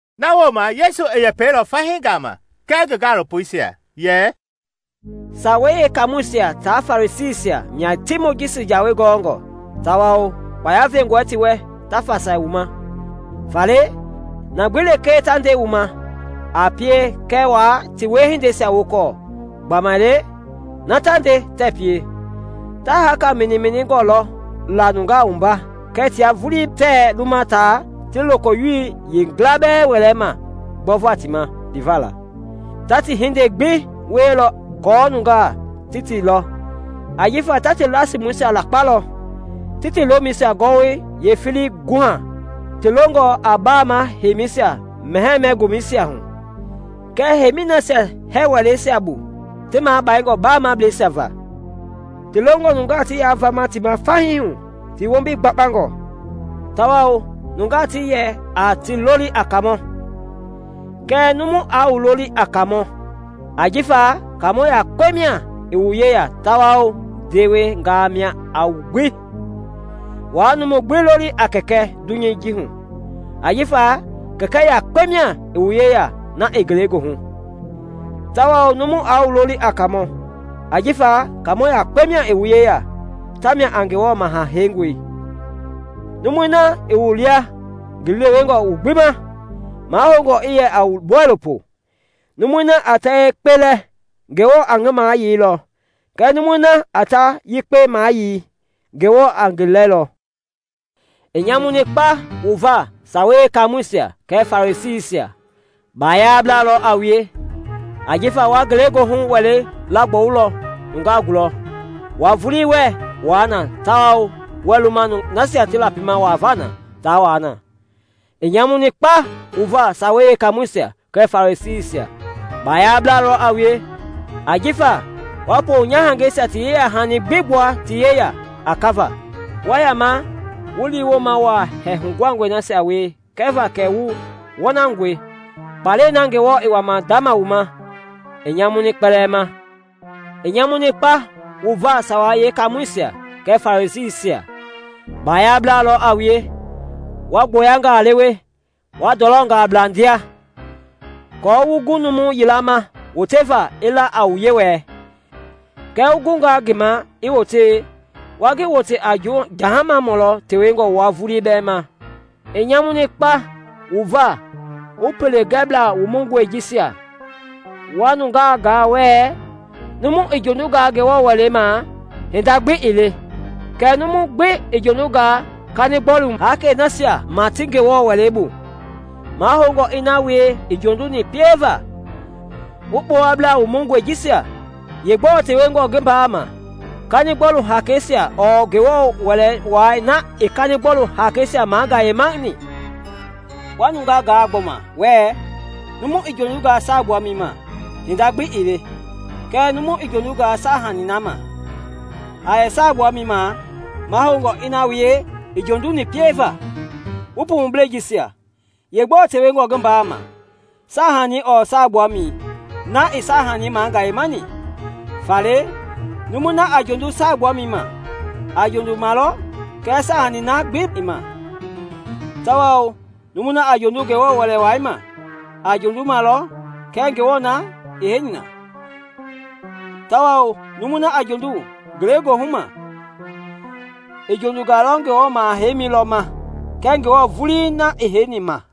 Na wooma Yesu i yɛpɛilɔ fahii gama kɛɛ ngi gaalopoisia yɛ, “Sawei Yeekaamɔisia tia Farisiisia mia ti Mojisi Jawei gɔngɔ tawao kpaya vengɔ ti wɛ ta fasai wu ma. Faale, na gbi lekee ta nde wu ma, a pie kɛɛ waa ti wiehindeisia wokɔɔ gbamaile na ta nde tɛɛ pie. Ta haaka miniminingɔ lɔ la nungaa wumba kɛɛ tia vulii tɛɛ luma taa ti lokoyowo yila bɛɛ wɛlɛ ma gbɔva ti ma liva la. Ta ti hindei gbi wielɔ aako nungaa ti ti lɔ; ajifa ta ti lasimɔisia lakpalɔ, ti ti lomɛi gɔwɔyɛi yeefilii guha. Ti longɔ a baama heimisia mɛhɛɛ-mɛ-gomɛisia hu, kɛɛ heimi nasia hɛɛ wɛleisia bu ti magbingɔ baamableisia va. Ti longɔ nungaa ti yaa vama ti ma fahii hu ti wombi gbakpa, tawao nungaa ti yɛ a ti loli a kaamɔ. Kɛɛ numu aa wu loli a kaamɔ, ajifa kaamɔ yakpe mia i wu yeya tawao ndewengaa lɔ a wu gbi. Waa numu gbi loli a kɛkɛ dunyei hu, ajifa Kɛkɛ yakpe mia i wu yeya, na i ngelegoohu. Tawao numu aa wu loli a kaamɔ, ajifa kaamɔ yakpe mia i wu yeya, tamia a Ngewɔ Maha Heingɔi. Numui na i wu lia ngi lewengɔ wu gbi ma, mahoungɔ i yɛ a wu bɔilopoi. Numui na a ta yekpe lɛ, Ngewɔ a ngi mayeilɔ kɛɛ numui na a ta yekpe maayei, Ngewɔ a ngi lɛlɔ. “I nyamuni kpa wu va Sawei Yeekaamɔisia kɛɛ Farisiisia! Baayablaa lɔ a wue! Ajifa wa ngelegoohu wɛlei laagbɔwulɔ nungaa gulɔ, wua vulii wɛɛ wuaa na tawao wɛɛ luma nasia ti lapima wuava na taa wuaa na. [ I nyamuni kpa wu va Sawei Yeekamɔɛisia kɛɛ Farisiisia! Baayablaa lɔ a wue! Ajifa wa ponyahangɛisia ti yeyahani gbi gbua ti yeya a kava, wa yama wu liiwooma wa hɛɛ huguhangɔisia wie kɛva kɛ wu wɔnangɔe; kpalɛi na Ngewɔ i wama ndama wu ma a nyamu kpɛlɛɛ ma!] “I nyamuni kpa wu va Sawei Yeekaamɔisia kɛɛ Farisiisia! Baayablaa lɔ a wue! Wa gboyangaa lewe, wa ndɔlɔngaa bla ndia aako wu gu numu yila ma woteva i la a wu Yewɔɛi, kɛɛ wu gungaa ngi ma i wote, wa ngi wote a jahamamɔ lɔ tewengɔ wua vulii ma. “I nyamuni kpa wu va, wu pele gɛbla wumungɔi jisia! Wa nungeisia gaa wɛɛ, ‘Numu i jondungaa Ngewɔ Wɛlei ma, hinda gbi ii le; kɛɛ numu gbi i jondungaa kanigbɔlu haakei nasia ma ti Ngewɔ Wɛlei bu, mahoungɔ i na wie i jonduni pieva.’ Wu kpowablaa wumungɔi jisia! Yeegbɔɔ tewengɔ ngi mbaa ma, kanigbɔlu haakeisia ɔɔ Ngewɔ Wɛlei Wai na i kanigbɔlu haakeisia magayemani? Wa nungaa gaa gbɔma wɛɛ, ‘Numu i jondungaa saagbuamɛi ma, hinda gbi ii le; kɛɛ numu i jondungaa saahanii na ma a yɛ saagbuamɛi ma, mahoungɔ i na wie i jonduni pieva.’ Wu pumublɛi jisia! Yeegbɔɔ tewengɔ ngi mbaa ma, saahanii ɔɔ saagbuamɛi na i saahanii magayemani? Faale numui na a jondu saagbuamɛi ma, a jondu ma lɔ kɛɛ saahani na gbi i ma; tawao numui na a jondu Ngewɔ Wɛlei Wai ma, a jondu ma lɔ kɛɛ Ngewɔ na i heini na; tawao numui na a jondu ngelegoohu ma, i jondunga Ngewɔ maha-heimi lɔ ma kɛɛ Ngewɔ vulii i heini ma.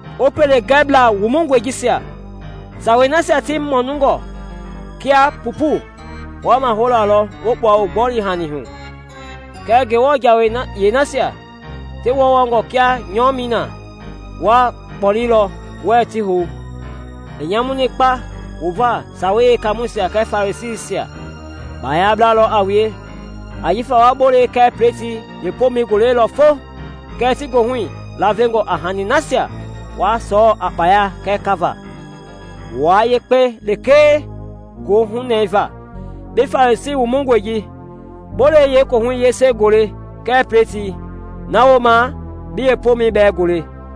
Wu pele gɛbla wumungɔi jisia! Sawei nasia ti mumungɔ kia pupu, wa maholalɔ wu kpua wu gboli-hani hu, kɛɛ Ngewɔ jawei yeenasia ti wɔngɔngɔ kia nyɔmɛi i na, wa kpɔlelɔ, wɛɛ ti hou. “I nyamuni kpa wu va, Sawei Yeekaamɔisia kɛɛ Farisiisia! Baayablaa lɔ a wue! Ajifa wa bolei kɛɛ pletii yeepomɛi golelɔ fo, kɛɛ ti goohui lavengɔ a hani nasia wa sɔɔ a kpaya kɛɛ kava, wua yekpe lekee gohunɛva. Bi Farisiimɔ wumungɔi ji! Bolei yeekohui yese gole kɛɛ pletii, na wooma bi yeepomɛi bɛɛ gole.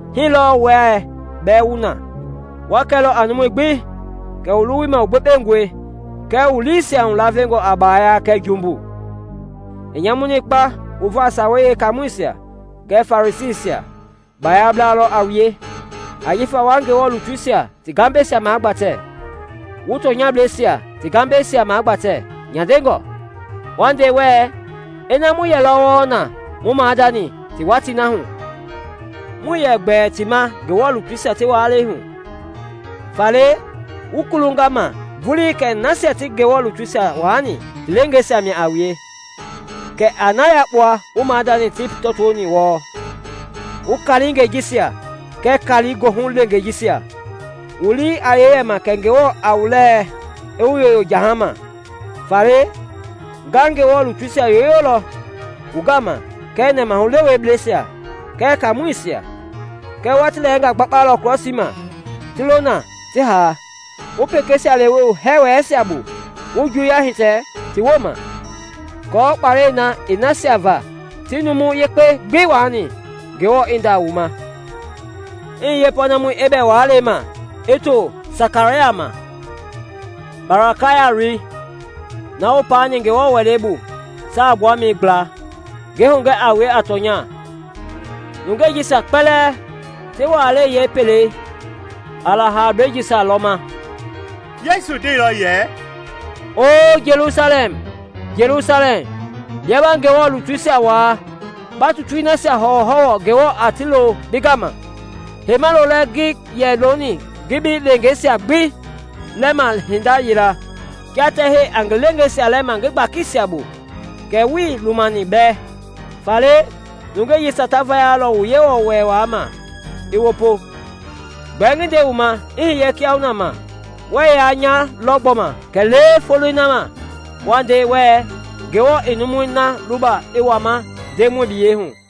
Hii lɔɔ wua bɛɛ wu na, wa kɛlɔ a numui gbi wu luwui ma kɛ wu yekpengɔe kɛɛ wu liisia lavengɔ a baaya kɛɛ jumbu. “I nyamuni kpa wu va Sawei Yee kaamɔisia kɛɛ Farisiisia! Baayablaa lɔ a wue! Ajifa wa Ngewɔ lutuisia ti gambɛisia gbatɛ, wu tɔnyablɛisia ti gambɛisia magbatɛ nyandengɔ, wa nde wɛɛ, ‘Ina mu yɛlɔ wɔɔ na mu maadani ti watii hu, muii yɛ gbɛɛ ti ma Ngewɔ lutuisia ti waalɛi hu.’ Faale wu kulunga ma vulii kɛ nasia ti Ngewɔ lutuisia waani ti leengeisia mia a wue! Kɛ a na yakpua wu maadani ti tɔtoni wɔɔ. Wu kaalingɛi jisia kɛɛ kaali goohu leengeisia! Wu lii a yee yɛ ma kɛ Ngewɔ ɛɛ wu lɛɛ aa wu yoyo jahama? Faale nga Ngewɔ lutuisia yoyolɔ wu gama kɛɛ nɛmahulewebleisia kɛɛ kaamɔisia, kɛɛ wa ti lɛɛnga gbakpalɔ krɔsii ma ti lo na ti haa, wu pekeisia lewe wu hɛɛ wɛleisia bu, wu juuya hitɛ ti woma, aako kpalɛi na i na nasia va ti numu yekpei gbi waani, Ngewɔ i nda wu ma, i hiye pɔɔnamɔi Ebɛl waalɛi ma i to Sakaraya ma, Barakaya loi, na wu paani Ngewɔ Wɛlei bu saagbuamɛi gbla. Ngi hugɛ a wue a tɔnya, nungei jisia kpɛlɛɛ ti waalɛi yee kpelɛi a la haablei jisia lɔ ma.” Yesu ndeilɔ yɛ, “Oo Jelusalɛm, Jelusalɛm! Bia ba Ngewɔ lutuisia waa, ba tutui nasia hɔwɔhɔwɔ Ngewɔ a ti lo bi gama! Heima lolɛ ngi yɛ loni ngi bi leengeisia gbi lɛma hinda yila, kia tɛhɛi a ngi leengeisia lɛma ngi gbakisia bu, kɛɛ wuii lumani mbɛ! Faale nungeisia ta vayalɔ wu Yewɔ Wɛlei Wai ma i wopo. Gbɛɛ ngi nde wu ma, i hiye kiahuna ma, wɛɛ yaa nya lɔ gbɔma kɛlee foloi na ma wa nde wɛɛ, ‘Ngew� � i numui na luba i wama Ndemɔi biyei hu.’”